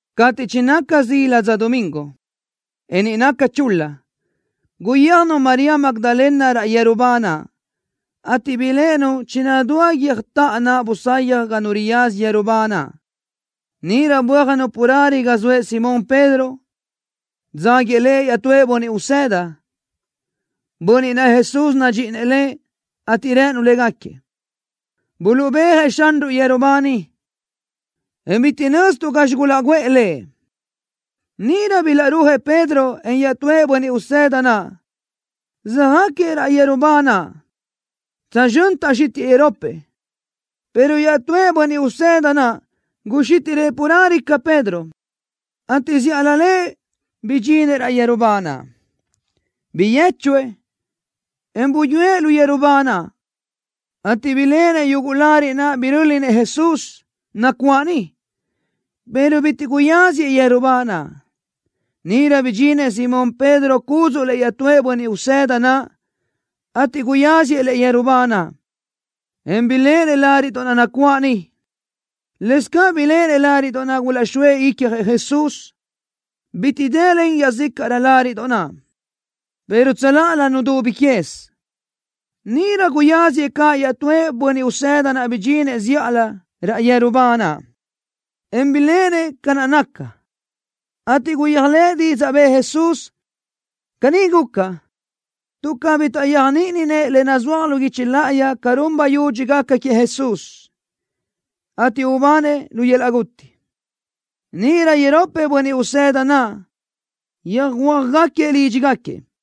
Cateʼ chinaca zíladoʼ dza domingo, en niʼ naca chul-la, guyéajnu María Magdalena raʼ yeru ba naʼ, ateʼ biléʼenu chinadúa guiö́jtaʼa naʼ busayaj ga nu riyaza yeru ba naʼ. Níʼirö bö́ajnu carelö ga zoëʼ Simón Pedro, dzáguiëʼ lëʼ iaʼtúëʼ bönniʼ usëda, bönniʼ naʼ Jesús nadxíʼinëʼ lëʼ, ateʼ rënu légaquiëʼ: —Buluʼbéajëʼ Xanruʼ yeru ba niʼ, en bitiʼ nöztuʼ gazxi gulaʼguʼë Lëʼ. Níʼirö bilaʼrúajëʼ Pedro, en iaʼtúëʼ bönniʼ usëda naʼ, söjáquiëʼ raʼ yeru ba naʼ. Tsözxö́n taʼxítiʼë iropëʼ, pero iaʼtúëʼ bönniʼ usëda naʼ guxítiʼrëʼ carelö ca Pedro, ateʼ zíʼalö lëʼ bidxinëʼ raʼ yeru ba naʼ. Biyéchuëʼ, en buyúëʼ lu yeru ba naʼ, ateʼ biléʼenëʼ yuguʼ láriʼdoʼ naʼ bilaʼröli-nëʼ Jesús, nacuáʼ niʼ, pero bitiʼ guyáziëʼ yeru ba naʼ. Níʼirö bidxinëʼ Simón Pedro cúdzuʼlëʼ iaʼtúëʼ bönniʼ usëda naʼ, ateʼ guyáziëʼ lëʼ yeru ba naʼ, en biléʼenëʼ láriʼdoʼ naʼ nacuáʼ niʼ. Lëscaʼ biléʼenëʼ láriʼdoʼ naʼ gulaʼxóëʼ icjëʼ Jesús, bitiʼ dëlen iaʼzícaʼrö láriʼdoʼ naʼ, pero tsöláʼalö nudubi quez. Níʼirö guyáziëʼ caʼ iaʼtúëʼ bönniʼ usëda naʼ bidxinëʼ zíʼalö raʼ yeru ba naʼ, en biléʼenëʼ ca naʼ naca, ateʼ guyéajlëʼë didzaʼ bëʼë Jesús. Caní guca, tuʼ cabí taʼyéajniʼininëʼ le nazúaj lu guichi láʼayi ca run bayudxi gaca queëʼ Jesús, ateʼ ubanëʼ lu yöl-laʼ guti. Níʼirö iropëʼ bönniʼ usëda naʼ yöjhuö́jgaquiëʼ lídxigaquiëʼ.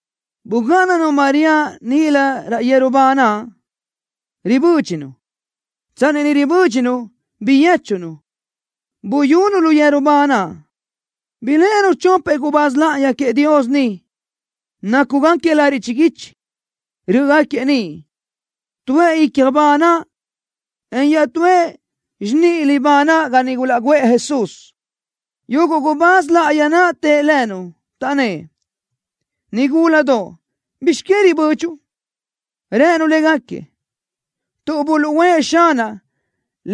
Bugáʼananu María níʼilö raʼ yeru ba naʼ, ribö́dxinu. Tsanni niʼ ribö́dxinu, biyéchunu, buyunu lu yeru ba naʼ. Biléʼenu chopëʼ gubáz láʼayi queëʼ Dios niʼ, nácugaquiëʼ lariʼ chiguichi. Rö́ʼögaquiëʼ niʼ, tuëʼ ícjalö ba naʼ, en iaʼtúëʼ xiníʼalö ba naʼ ga niʼ gulaʼguʼë Jesús. Yuguʼ gubáz láʼayi naʼ tëʼ lënu, taʼnnë́ʼ: —Nigúladoʼ, ¿bizx que ribödxuʼ? Rënu légaquiëʼ: —Tuʼ buluʼúʼë Xanaʼ,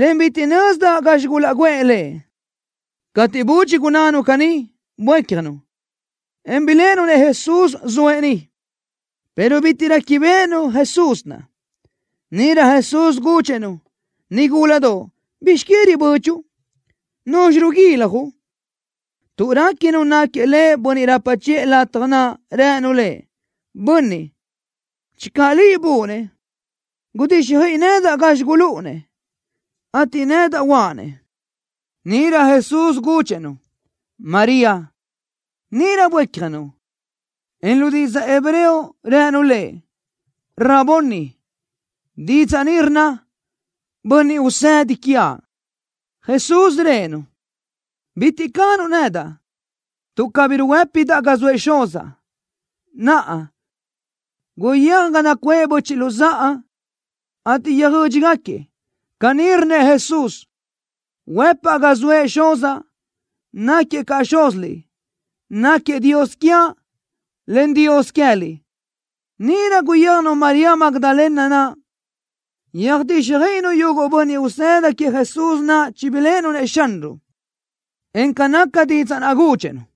en bitiʼ nözdaʼ gazxi gulaʼguʼë Lëʼ. Cateʼ budxi gunnánu caní, buécjanu, en biléʼenu-nëʼ Jesús, zoëʼ niʼ, pero bitiʼ réquibeʼenu Jesús naʼ. Níʼirö Jesús gudxëʼ-nu: —Nigúladoʼ, ¿bizx que ribödxuʼ? ¿Nuzxi ruguiljuʼ? Tuʼ réquinu náquiëʼ Lëʼ bönniʼ rapa chiʼë latja naʼ, rënu Lëʼ: —Bönniʼ, channö liʼ buʼu-nëʼ, gudíxjöiʼi nedaʼ gazxi gulúʼu-nëʼ, ateʼ nedaʼ uʼa-nëʼ. Níʼirö Jesús gudxëʼ-nu: —María. Níʼirö buécjanu, en lu didzaʼ hebreo rënu Lëʼ: —Raboni. Didzaʼ ni rnna: Bönniʼ Usedi quiaʼ. Jesús rëʼë-nu: —Bitiʼ canuʼ nedaʼ, tuʼ cabí ruhuë́pinidaʼ ga zoëʼ Xuzaʼ. Naʼa, guyéaj ga nacuʼë böchiʼ luzáʼa, ateʼ yöjödxi-gáquiëʼ: “Caní rnnëʼ Jesús: Huëpaʼ ga zoëʼ Xuzaʼ, náquiëʼ caʼ Xúziliʼ. Náquiëʼ Dios quiaʼ, en Dios queë́liʼ.” Níʼirö guyéajnu María Magdalena naʼ, yöjtíxjöiʼinu yuguʼ bönniʼ usëda queëʼ Jesús chibiléʼenu-nëʼ Xanruʼ, en ca naca didzaʼ naʼ gudxëʼ-nu.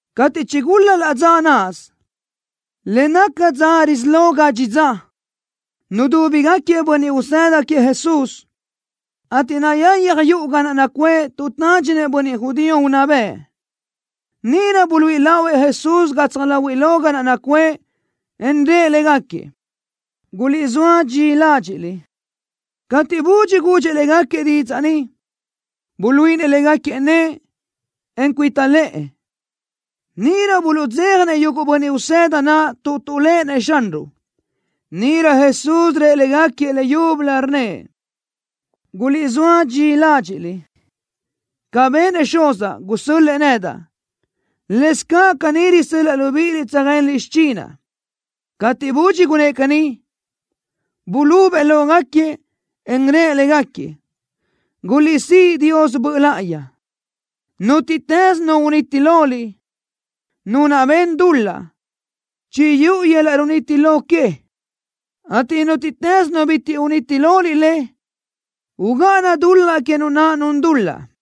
Cateʼ chigul-la laʼ dza náʼasö, le naca dza risí lo gadxi dza, nudúbigaquiëʼ bönniʼ usëda queëʼ Jesús, ateʼ nayayaj yuʼu ga naʼ nacuʼë tuʼ tádxinëʼ bönniʼ judío unná bëʼ. Níʼirö buluíʼi lahuëʼ Jesús gatsaj láhuiʼlö ga naʼ nacuʼë, en rëʼ légaquiëʼ: —Guliʼzóa dxi ládxiʼliʼ. Cateʼ budxi gudxëʼ légaquiëʼ didzaʼ ni, buluíʼinëʼ légaquiëʼ nëʼë, en cuita lëʼë. Níʼirö tuʼdzéjanëʼ yuguʼ bönniʼ usëda naʼ tuʼ tuʼléʼenëʼ Xanruʼ. Níʼirö Jesús rëʼ légaquiëʼ leyúbölö, rnnëʼ: —Guliʼzóa dxi ládxiʼliʼ. Ca benëʼ Xuzaʼ, gusö́l-lëʼë nedaʼ, lëscaʼ caní risö́l-laʼa libíʼiliʼ tsöjenliʼ xichinaʼ. Cateʼ budxi gunnë́ʼ caní, bulubëʼ lógaquiëʼ, en rëʼ légaquiëʼ: —Guliʼsíʼ Dios Böʼ Láʼayi. Nútiʼtës nu uniti loliʼ, nu naʼ ben dul-laʼ, chiyúʼu yöl-laʼ runiti lo que, ateʼ nútiʼtës nu bitiʼ uniti loliʼ le, ugáʼana dul-laʼ que nu naʼ nun dul-laʼ.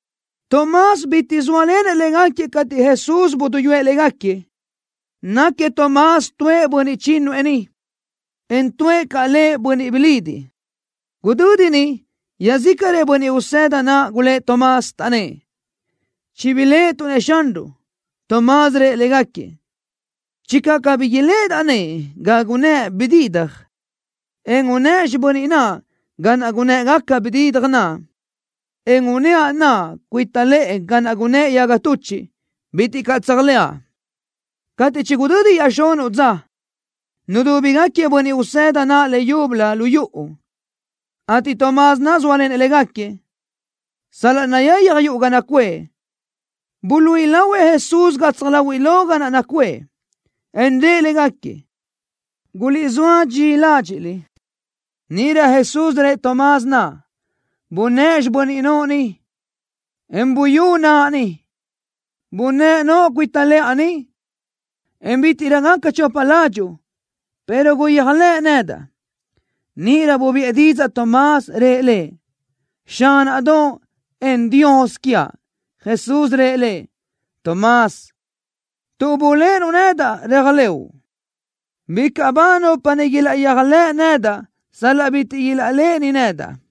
Tomás bitiʼ zóalenëʼ légaquiëʼ cateʼ Jesús buduyúëʼ légaquiëʼ. Náquiëʼ Tomás tuëʼ bönniʼ chínnuëʼ niʼ, en tuʼë caʼ lëʼ Bönniʼ Bilidiʼ. Gudödi niʼ iaʼzícaʼrëʼ bönniʼ usëda naʼ gulë́ʼ Tomás, taʼnnë́ʼ: —Chibiléʼetuʼ-nëʼ Xanruʼ. Tomás rëʼ légaquiëʼ: —Channö cabí iléʼedaʼ nëʼë ga gunnë́ʼ bididaj, en unëʼa xibö́n naʼa ga naʼ gunë́ʼgaca bididaj naʼ, en unëʼa naʼa cuita lëʼë ga naʼ gunnë́ʼ yaga tuchiʼ, bitiʼ caʼ tséajlëʼa. Cateʼ chigudödi iaʼxunuʼ dza, nudúbigaquiëʼ bönniʼ usëda naʼ leyúbölö lu yuʼu, ateʼ Tomás naʼ zóalenëʼ légaquiëʼ. Sal-laʼ nayayaj yuʼu ga naʼ nacuʼë, buluíʼi lahuëʼ Jesús gatsaj láhuiʼlö ga naʼ nacuʼë, en rëʼ légaquiëʼ: —Guliʼzóa dxi ládxiʼliʼ. Níʼirö Jesús rëʼ Tomás naʼ: —Bunë́ʼ xibö́n noʼo ni, en buyú naʼa ni. Bunë́ʼ noʼo cuita lëʼa ni, en bítiʼrö gaca chopa ládxuʼu, pero guyéajlëʼ nedaʼ. Níʼirö bubiʼë didzaʼ Tomás, rëʼ Lëʼ: —Xánaʼdoʼ, en Dios quiaʼ. Jesús rëʼ lëʼ: —Tomás, tuʼ buléʼenuʼ nedaʼ, réajlëʼu. Bicaʼ ba nupa niʼ ilaʼyéajlëʼ nedaʼ sal-laʼ bitiʼ ilaʼléʼeni nedaʼ.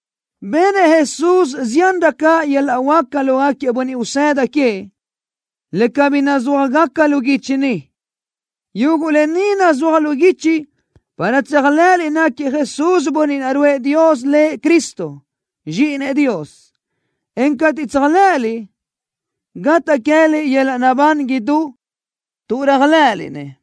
Benëʼ Jesús ziánrö caʼ yöl-laʼ huáca lógaquiëʼ bönniʼ usëda queëʼ, le cabí nazúajgaca lu guichi ni. Yuguʼ lë ni nuzúajaʼ lu guichi para tséajlëʼëliʼ náquiëʼ Jesús Bönniʼ naʼ ruʼë Dios lëʼ Cristo, Zxíʼinëʼ Dios, en cateʼ tséajlëʼëliʼ, gataʼ queë́liʼ yöl-laʼ naʼbán idú tuʼ réajlëʼëliʼ-nëʼ.